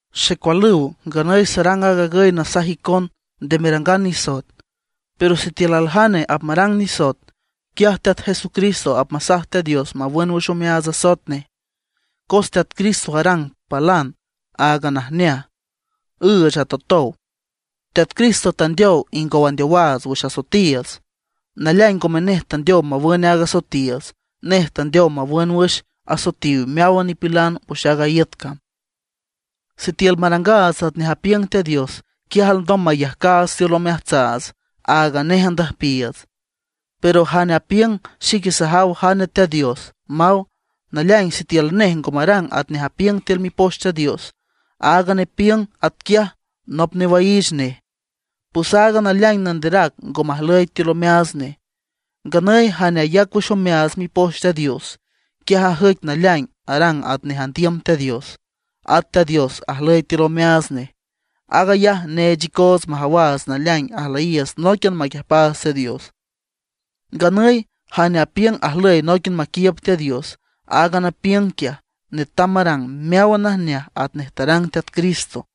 Xecualüw, nganüy sarang aag agüy nasaj icon nde merangan nisoet; pero sitiül aljane apmarang nisoet, quiaj Teat Jesucristo apmasaj Teat Dios mawün wüx omeaats asoet nej. Cos Teat Cristo arang palan áagan najneaj, üüch atowtow. Teat Cristo tandeow ingow andeowaats wüx asoetiiüts. Naleaing ngome nej tandeow mawün áagan asoetiiüts, nej tandeow mawün wüx asoetiw meáwan nipilan wüx aaga iüt cam. Sitiül marangaats atnej apiüng Teat Dios, quiaj alndom mayajcaats tiül omeajtsaats áagan nej andüjpiiüts. Pero jane apiüng: “Xique sajaw jane Teat Dios”, maw; naleaing sitiül nej ngo marang atnej apiüng tiül Mipoch Teat Dios, aaga nepiüng atquiaj nop newaiich nej; pues aaga naleaing nanderac ngo majlüy tiül omeaats nej. Nganüy jane ayac wüx omeaats Mipoch Teat Dios, quiaj ajüic naleaing arang atnej andiüm Teat Dios, at Teat Dios ajlüy tiül omeaats nej. Aag ayaj neech icoots majawaats naleaing ajlüyiiüts nóiquian maquiüjpaats Teat Dios. Nganüy jane apiüng ajlüy nóiquian maquiiüb Teat Dios, aaga nepiüng quiaj netam marang meáwan najneaj atnej tarang Teat Cristo.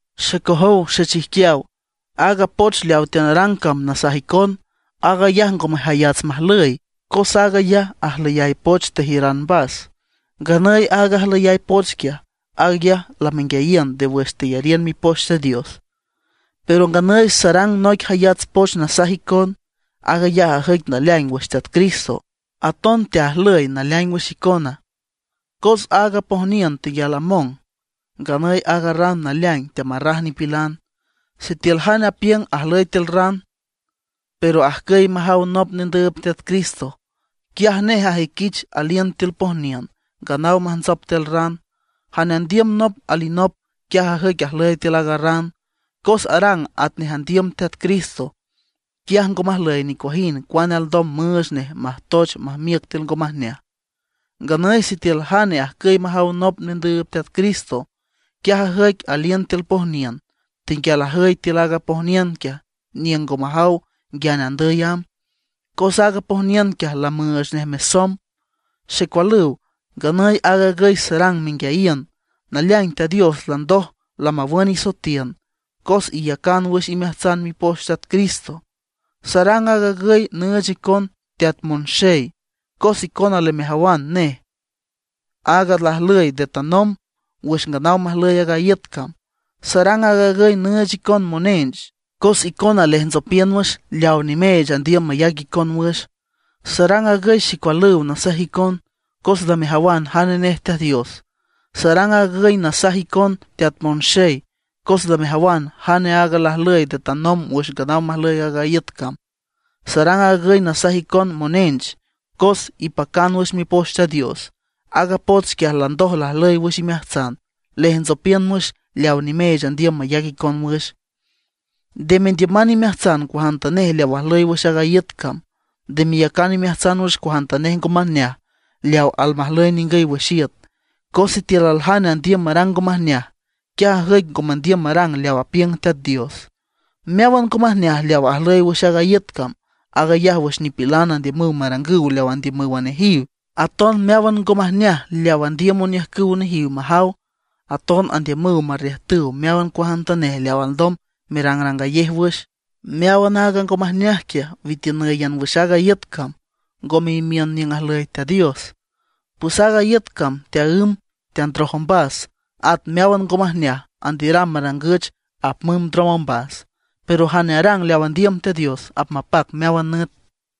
Xecojow xechijquiaw, aaga poch leaw teanarang cam nasaj icon, aag ayaj ngome jayats majlüy, cos aag ayaj ajlüyay poch tejiüran mbas; nganüy aaga ajlüyay poch quiaj, aag ayaj lamenguiayiün nde wüx teyariün Mipoch Teat Dios. Pero nganüy sarang noic jayats poch nasaj icon. Aag ayaj ajüic naleaing wüx Teat Cristo, aton teajlüy naleaing wüx icona. Cos aaga pojniün tenguial among; nganüy aaga ran naleaing teamarraj nipilan. Sitiül jane apiüng ajlüy tiül ran, pero ajcüy majaw alinop nendüüb Teat Cristo, quiaj nej ajüiquich aliün tiül pojniün, nganaw majntsop tiül ran. Jane andiüm nop alinop, quiaj ajüic ajlüy tiül aaga ran, cos arang atnej andiüm Teat Cristo. Quiaj ngo majlüy nicuajind cuane alndom müüch nej majtoech majmiüc tiül ngo majneaj. Nganüy sitiül jane ajcüy majaw alinop nendüüb Teat Cristo, quiaj ajüic aliün tiül pojniün; tenguial ajüy tiül aaga pojniün quiaj niüng ngo majaw nguiane andüy amb, cos aaga pojniün quiaj lamüüch nej mesomb. Xecualüw, nganüy aag agüy sarang menguiayiün, naleaing Teat Dios landoj lamawün isoetiün, cos iyacan wüx imeajtsan mipoch Teat Cristo. Sarang aag agüy nüüch icon, teat monxey, cos icona lamejawan nej, aaga lajlüy nde tanomb wüx nganaw majlüy aaga iüt cam. Sarang aag agüy nüüch icon monench, cos icona lejntsopiün wüx leaw nimeech andiüm mayac icon wüx. Sarang aag agüy xecualüw nasaj icon, cos lamejawan jane nej Teat Dios. Sarang aag agüy nasaj icon teat monxey, cos lamejawan jane aaga lajlüy nde tanomb wüx nganaw majlüy aaga iüt cam. Sarang aag agüy nasaj icon monench, cos ipacan wüx Mipoch Teat Dios. Aaga poch quiaj landoj lajlüy wüx imeajtsan; lejntsopiün wüx leaw nimeech andiüm mayac icon wüx. Nde mendiüman imeajtsan cuajantanej leaw ajlüy wüx aaga iüt cam. Nde meyacan imeajtsan wüx cuajantanej ngo majneaj leaw almajlüy ningüy wüx iüt; cos sitiül aljane andiüm marang ngo majneaj, quiaj ajüic ngo mandiüm marang leaw apiüng Teat Dios. Meáwan ngo majneaj leaw ajlüy wüx aaga iüt cam, aag ayaj wüx nipilan andiümüw marangüw leaw andiümǘwan nejiw, aton meáwan ngo majneaj leaw andiüm oniüjcüw nejiw majaw, aton andiümüw majiürüw meáwan cuajantanej leaw alndom merangrangayej wüx. Meáwan aaga ngo majneaj quiaj witiünǘyan wüx aaga iüt cam, ngome imiün niüng ajlüy Teat Dios. Pues aaga iüt cam teaǘmb teandroj ombas, at meáwan ngo majneaj andiüram marangüch apmümb ndrom ombas. Pero jane arang leaw andiüm Teat Dios apmapac meáwan nüt.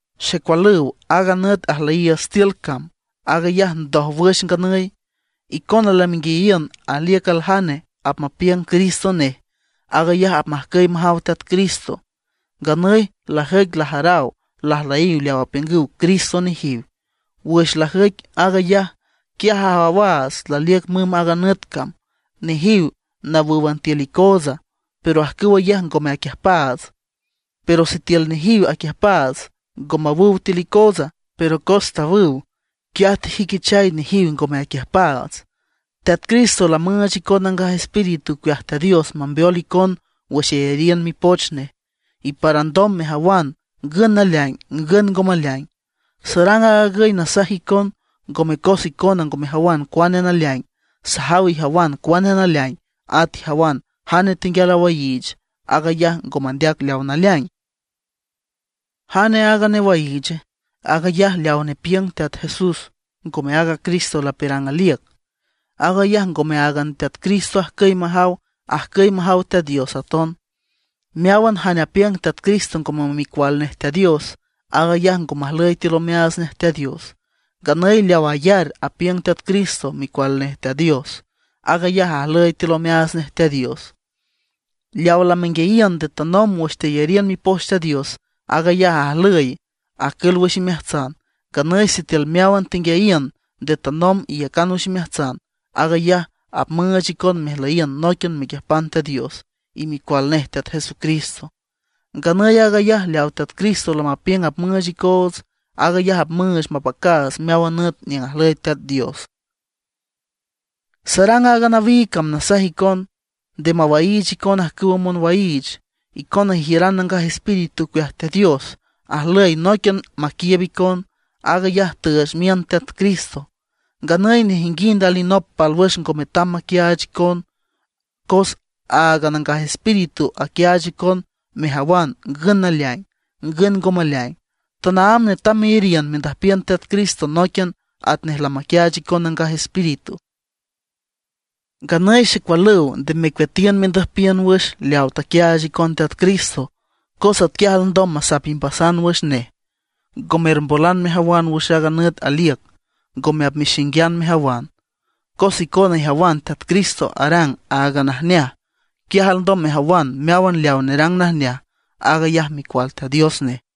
Xecualüw, aaga nüt ajlüyiiüts tiül cam, aag ayaj ndójwüx nganüy. Icona lamenguiayiün aliüc aljane apmapiüng Cristo nej; aag ayaj apmajcüy majaw Teat Cristo. Nganüy lajüic lajaraw lajlüyiw leaw apiüngüw Cristo nejiw. Wüx lajüic aag ayaj, quiaj ajawaats laliüc mümb aaga nüt cam. Nejiw nawǘwan tiül icootsa, pero ajcüw ayaj ngome aquiüjpaats, cos sitiül nejiw aquiüjpaats, ngo mawüw tiül icootsa. Pero cos tawüw, quiaj tejüiquichay nejiw ngome aquiüjpaats. Teat Cristo lamüüch icon Nangaj Espíritu ocueaj Teat Dios mambeol icon wüx iyariün mipoch nej, y para alndom mejawan ngün naleaing, ngün ngo maleaing. Sarang aag agüy nasaj icon, ngome cos icona ngo mejawan cuane naleaing; sajaw ijawan cuane naleaing, at ijawan jane tenguial awaiich aag ayaj ngo mandeac leaw naleaing. ¿Jane aaga newaiiche? Aag ayaj leaw nepiüng Teat Jesús ngome aaga Cristo lapiürang aliüc. Aag ayaj ngome áagan Teat Cristo ajcüy majaw; ajcüy majaw Teat Dios aton. Meáwan jane apiüng Teat Cristo ngome Micual nej Teat Dios, aag ayaj ngo majlüy tiül omeaats nej Teat Dios. Nganüy leaw ayar, apiüng Teat Cristo Micual nej Teat Dios, aag ayaj ajlüy tiül omeaats nej Teat Dios. Leawa lamenguiayiün nde tanomb wüx teyariün Mipoch Teat Dios, aag ayaj ajlüy, acül wüx imeajtsan. Nganüy sitiül meáwan tenguiayiün nde tanomb iyacan wüx imeajtsan, aag ayaj apmüüch icon mejlüyiün nóiquian mequiüjpan Teat Dios y Micual nej Teat Jesucristo. Nganüy aag ayaj leaw Teat Cristo lamapiüng apmüüch icoots, aag ayaj apmüüch mapacaats meáwan nüt niüng ajlüy Teat Dios. Sarang aaga nawiig cam nasaj icon nde mawaiich icon ajcüwa monwaiich. Icona ijiüran Nangaj Espíritu ocueaj Teat Dios; ajlüy nóiquian maquiiüb icon. Aag ayaj tüüch miün Teat Cristo. Nganüy nejinguind alinop pálwüx ngo metam maquiaach icon, cos aaga Nangaj Espíritu aquiaach icon mejawan ngün naleaing, ngün ngo maleaing. Tanaámb netam meyariün mendüjpiün Teat Cristo nóiquian atnej lamaquiaach icon Nangaj Espíritu. Nganüy xecualüw, nde mecueatiün mendüjpiün wüx leaw taquiaach Teat Cristo, cos atquiaj alndom masap imbasan wüx nej, ngo mermbolan mejawan wüx aaga nüt aliüc, ngome apmexinguiün mejawan. Cos icona ijawan Teat Cristo arang áagan najneaj, quiaj alndom mejawan meáwan leaw nerang najneaj, aag ayaj micual Teat Dios nej.